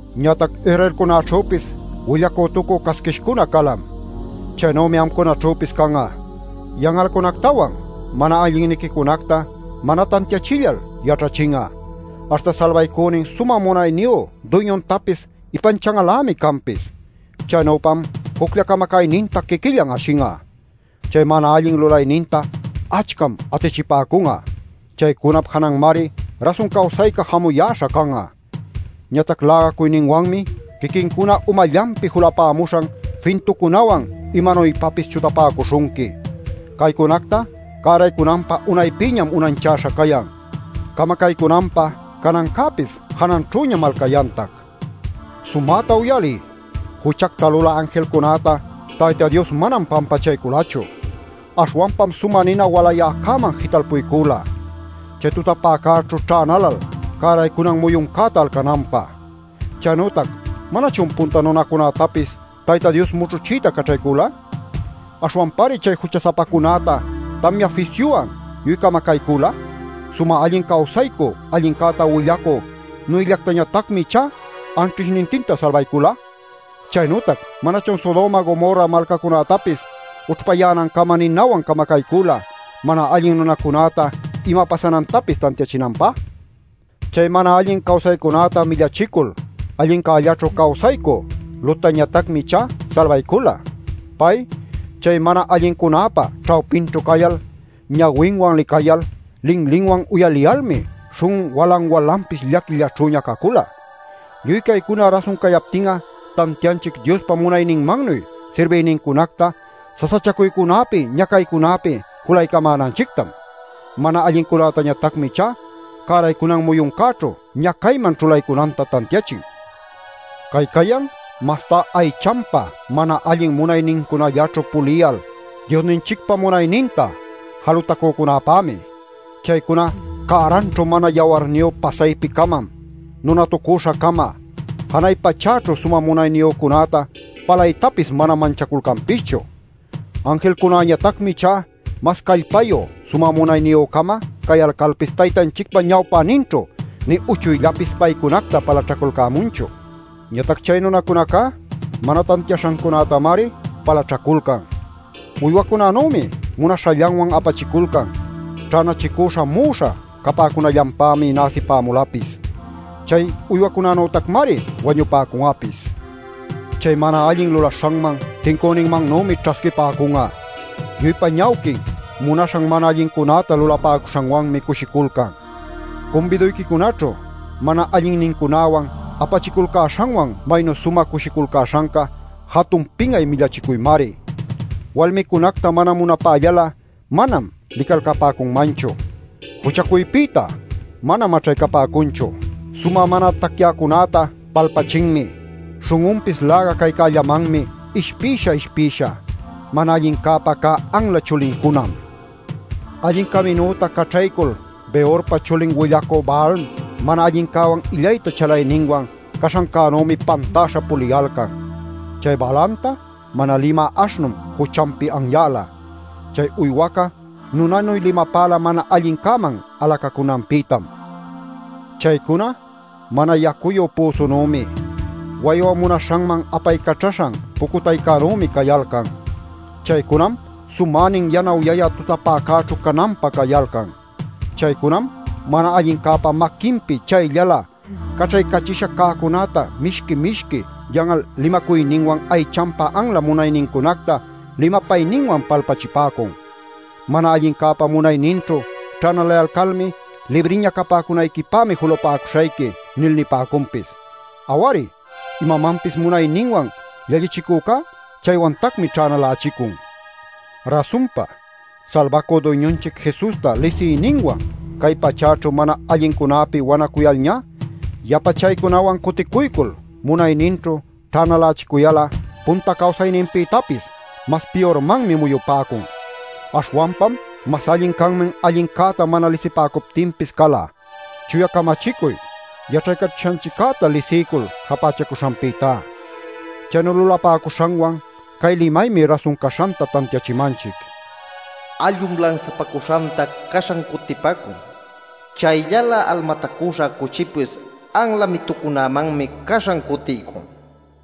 Ñatac Israelcunäćhüpis willacütucü casquishcuna calam. Chaynümi amcunaćhüpis can'a. Yan'alcunactawan mana allinniquicunactam mana tantiachillal yaćhachin'a, aśhta salbaycünin sumä munayniyu Duyñuntapis ipanchan'alämi canpis. Chaynüpam juclla camacayninta quiquillan ashin'a. Chay mana allin lulayninta achcam atichipäcun'a. Chaycunap jananmari rasun cawsayca jamuyäśha can'a. Ñatac lägacuyninwanmi quiquincuna umallanpi julapämuśhan fintucunawan imanuypapis chutapäcuśhunqui. Caycunacta cäraycunanpä unaypïñam unanchäśha cayan; camacaycunanpä canancäpis jananćhüñam alcayantac. Sumäta uyaliy: juchacta lulä anjilcunäta Tayta Dios manam pampachayculachu. Aśhwanpam sumä nina walayäcäman jitalpuycüla, chay tutapäcäćhu ćhänalal cäraycunan muyuncäta alcananpä. Chaynütac ¿manachun punta nunacunätapis Tayta Dios mućhuchiyta caćhaycula? Aśhwanpamari chay jucha-sapacunäta tamya fisyuwan lluy camacaycüla; sumä allin cawsacü allincäta willacü Noëllactañatacmi ichá anćhishnintinta salbaycula. Chaynütac ¿manachun Sodoma Gomorra malcacunätapis ućhpayänancama ninawan camacaycüla mana allin nunacunäta ima pasanantapis tantiachinanpä? Chay mana allin cawsaycunäta millachicul allincällaćhu cawsaycü Lottañatacmi ichá salbaycula. Pay chay mana allincunäpa ćhawpinćhu cayal, ñawinwan licayal, linlinwan uyaliyalmi śhun'un walan-walanpis llaquillaćhüña cacula. Lluy caycuna rasun cayaptin'a tantianchic Diospa munayninmannuy sirbïnincunacta sasachacuycunäpi ñacaycunäpi julaycamänanchictam. Mana allincunätañatacmi ichá cäraycunan muyuncäćhu ñacayman ćhulaycunanta tantiachin. Cay cayan mastá aychanpa mana allin munaynincunallaćhu puliyal Diosninchicpa munayninta jalutacücunäpämi. Chaycuna ¡cäranćhu mana yawarniyu pasaypi-camam nunatucüśha-cama! Janay pachäćhu sumä munayniyücunäta palaytapis manam manchaculcanpischu. Anjilcunäñatacmi ichá mas callpayu sumä munayniyü-cama cayalcalpis Taytanchicpa ñawpäninćhu nï uchuyllapis paycunacta palaćhacalcämunchu. Ñatac chay nunacunacá mana tantiaśhancunätamari palaćhaculcan. Uywacunanümi munaśhallanwan apachiculcan, ćhänachicüśha mu'uśha capäcunallanpämi näsipämulapis. Chay uywacunanütacmari wañupäcun'apis. Chay mana allin lulaśhanman tincüninmannümi ćhasquipäcun'a. Lluypa ñawquin munaśhan mana allincunäta lulapäcuśhanwanmi cushiculcan. Cumbiduyquicunaćhu mana allinnincunäwan apachiculcäśhanwan maynu sumä cushiculcäśhanca jatun pin'ay millachicuymari. Walmicunacta mana munapällal'a manam licalcapäcunmanchu. Juchacuypïta manam maćhaycapäcunchu. Sumä mana tacyäcunäta palpachinmi; śhun'unpis läga caycällamanmi ishpisha ishpisha. ¡Mana allincäpä cä anla chulincunam! Allin caminüta caćhaycul Beorpa chulin willacü Balaam mana allincäwan illayta chalayninwan caśhannümi pantäśha puliyalcan. Chay Balaamta mana limä aśhnum juchanpi anyäla; chay uywaca nunanuy limapäla mana allincäman alacäcunanpïtam. Chaycuna mana yacuyu püsunümi, waywa munaśhanman apaycaćhaśhan pucutaycänümi cayalcan. Chaycunam sumänin yanawyayä tutapäcäćhu cananpä cayalcan. Chaycunam mana allincäpa maquinpi chayllalä caćhaycächisha cäcunäta mishqui-mishqui yan'al limacuyninwan aychanpa anla munaynincunacta limapayninwan palpachipäcun. Mana allincäpa munayninćhu ćhänalayalcalmi “Libriña capäcunayquipämi julapäcuśhayqui” nil nipäcunpis. Aw-ari, imapapis munayninwan llallichicücá chaywantacmi ćhänalächicun. Rasunpa Salbacü Duyñunchic Jesusta lisiyninwan cay pachäćhu mana allincunäpi wanacuyalñá yapa chaycunawan cuticuycul munayninćhu ćhänalächicuyal'a punta cawsayninpïtapis mas piyurmanmi muyupäcun. Aśhwanpam mas allin canman allincäta mana lisipäcuptinpis cala, chuya camachicuy yaćhaycachishanchiccäta lisiycul japächacuśhanpïtá. Chaynu lulapäcuśhanwan cay limaymi rasun caśhanta tantiachimanchic: “Allum lansapacuśhanta caśhan cutipacun; chayllalä almatacüśha cuchipis anla mitucunämanmi caśhan cutiycun” nil nishanta.